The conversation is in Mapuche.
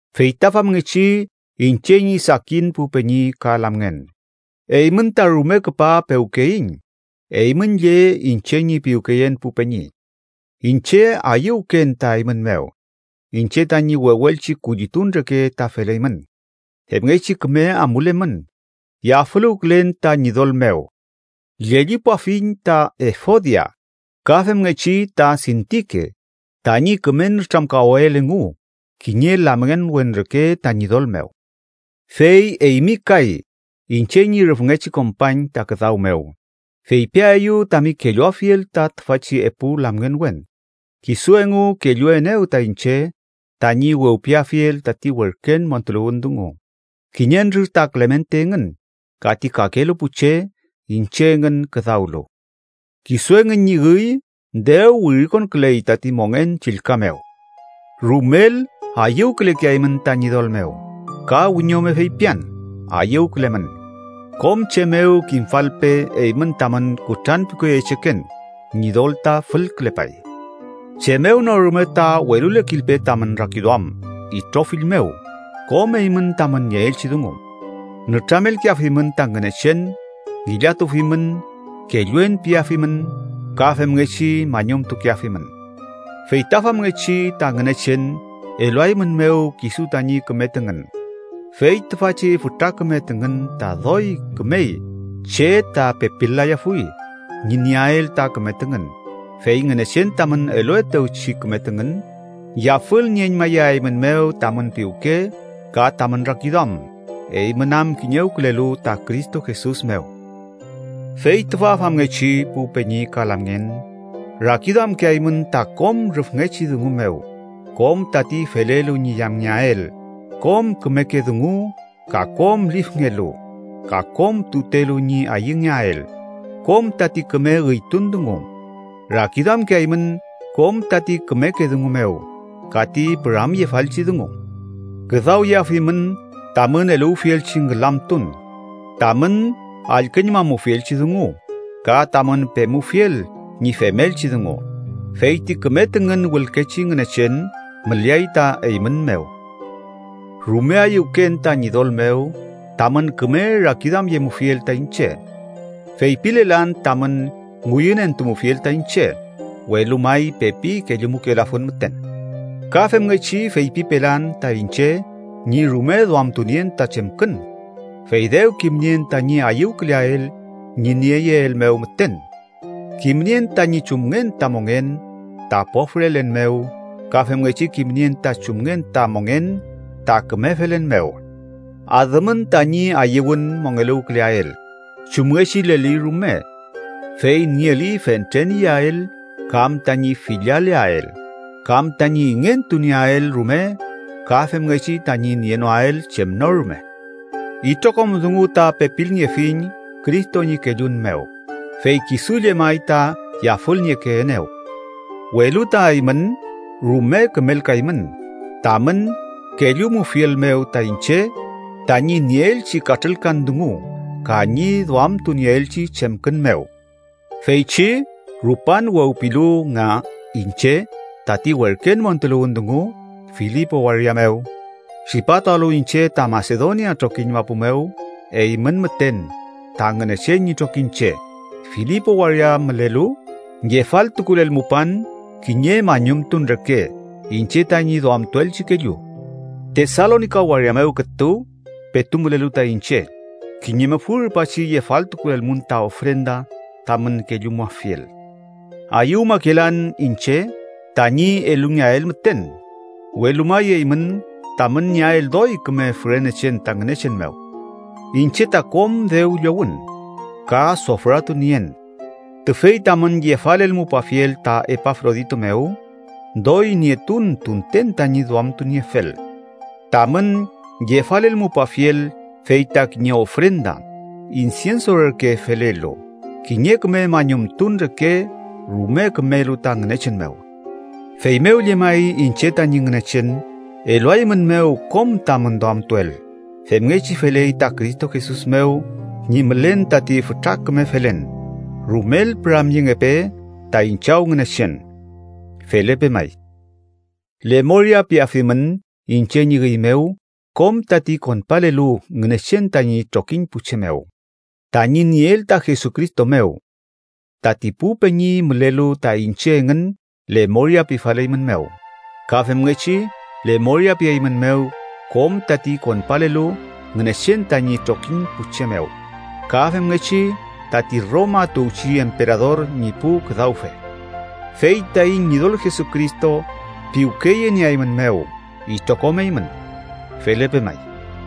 Fey ta famngechi iñche ñi sakin pu peñi ka lamngen, eymün ta rume küpa pewkeyiñ: Eymün lle, iñche ñi piwkeyen pu weni, iñche ayüwken ta eymün mew. Iñche tañi wewelchi kullitun reke ta feleymün, femngechi küme amulemün, yafüluwkülen ta Ñidol mew. Llellipuafiñ ta Efodia, ka femngechi ta Sintike, tañi küme nütramkawael engu kiñe lamngenwen reke ta Ñidol mew. Fey eymi kay iñche ñi rüfngechi kompañ ta küdaw mew, feypiaeyu tami kelluafiel ta tüfachi epu lamngenwen. Kisu engu kelluenew ta iñche tañi wewpiafiel tati werken montuluwün dungu, kiñentrür ta Klemente engün ka ti kakelu pu che iñche engün küdawlu. Kisu engün ñi üy dew wirikonküley tati mongen chillka mew. Rumel ayüwkülekeaymün ta Ñidol mew. Ka wiñome feypian: ¡Ayüwkülemün! Kom che mew kimfalpe eymün tamün kutranpiwkeyecheken. Ñidol ta fülkülepay. Chem mew no rume ta welulekilpe tamün rakiduam itrofill mew kom eymün tamün nieelchi dungu, nütramelkeafimün ta Ngünechen. Ngillatufimün, kelluen piafimün ka femngechi mañumtukeafimün. Fey ta famngechi ta Ngünechen eluaeymünmew kisu tañi küme tüngün, fey tüfachi fütra küme tüngün ta doy kümey che ta pepil-layafuy ñi nieael ta küme tüngün, fey Ngünechen tamün eluetewchi küme tüngün yafülnieñmayaeymünmew tamün piwke ka tamün rakiduam, eymün am kiñewkülelu ta Cristo Jesus mew. Fey tüfa famngechi, pu peñi ka lamngen, rakiduamkeaymün ta kom rüfngechi dungu mew, kom tati felelu ñi yamngeael, kom kümeke dungu, ka kom lifngelu, ka kom tutelu ñi ayüngeael, kom tati küme üytun dungu. Rakiduamkeaymün kom tati kümeke dungu mew ka ti püramyefalchi dungu. Küdawyeafimün tamün eluwfielchi ngülamtun, tamün allküñmamufielchi dungu, ka tamün pemufiel ñi femelchi dungu. Fey ti küme tüngün wülkechi Ngünechen müleay ta eymün mew. Rume ayüwken ta Ñidol mew tamün küme rakiduamyemufiel ta iñche. Feypilelan tamün ngüyünentumufiel ta iñche, welu may pepi kellumukelafun müten. Ka femngechi feypipelan ta iñche ñi rume duamtunien ta chemkün, fey dew kimnien tañi ayüwküleael ñi nieyeel mew müten. Kimnien tañi chumngen ta mongen ta pofrelen mew ka femngechi kimnien ta chumngen ta mongen ta küme felen mew. Adümün tañi ayüwün mongeluwküleael chumngechileli rume, fey nieli fentren iyael kam tañi fillaleael, kam tañi ingentu nieael rume ka femngechi tañi nienoael chem no rume. Itrokom dungu ta pepilniefiñ Cristo ñi kellun mew, fey kisu llemay ta yafülniekeenew. Welu ta, eymün rume kümelkaymün tamün kellumufiel mew ta iñche tañi nieelchi katrülkan dungu ka ñi duamtunieelchi chemkün mew. Feychi rupan wewpilu nga iñche tati werken montuluwün dungu Filipo waria mew, tripatualu iñche ta Masedonia trokiñ mapu mew, eymün müten, ta Ngünechen ñi trokiñche Filipo waria mülelu, yefaltukulelmupan kiñe mañumtun reke iñche tañi duamtuelchi kellu. Tesalonika waria mew kütu petu mülelu ta iñche, kiñe mufü rupachi yefaltukulelmun ta ofrenda tamün kellumuafiel. Ayüwmakelan iñche tañi elungeael müten, welu may eymün tamün nieael doy küme fürenechen ta Ngünechen mew. Iñche ta kom dew llowün, ka sofratu nien. Tüfey tamün yefalelmupafiel ta Epafrodito mew, doy nietun tunten tañi duamtuniefel. Tamün yefalelmupafiel fey ta kiñe ofrenda insienso reke felelu, kiñe küme mañumtun reke rume kümelu ta Ngünechen mew. Feymew llemay, iñche tañi Ngünechen, eluaeymünmew kom tamün duamtuel, femngechi feley ta Cristo Jesus mew ñi mülen tati fütra küme felen. ¡Rumel püramyengepe taiñ Chaw Ngünechen! Felepe may. Lemoria piafimün iñche ñi üy mew kom tati konpalelu Ngünechen tañi trokiñ pu che mew, tañi nieel ta Jesucristo mew. Tati pu peñi mülelu ta iñche engün lemoria pifaleymünmew. Ka femngechi lemoria pieymünmew kom tati konpalelu Ngünechen tañi trokiñ pu che mew ka femngechi tati Roma tuwchi emperador ñi pu küdawfe. Fey taiñ Ñidol Jesucristo piwkeyenieaeymünmew itrokom eymün. Felepe may.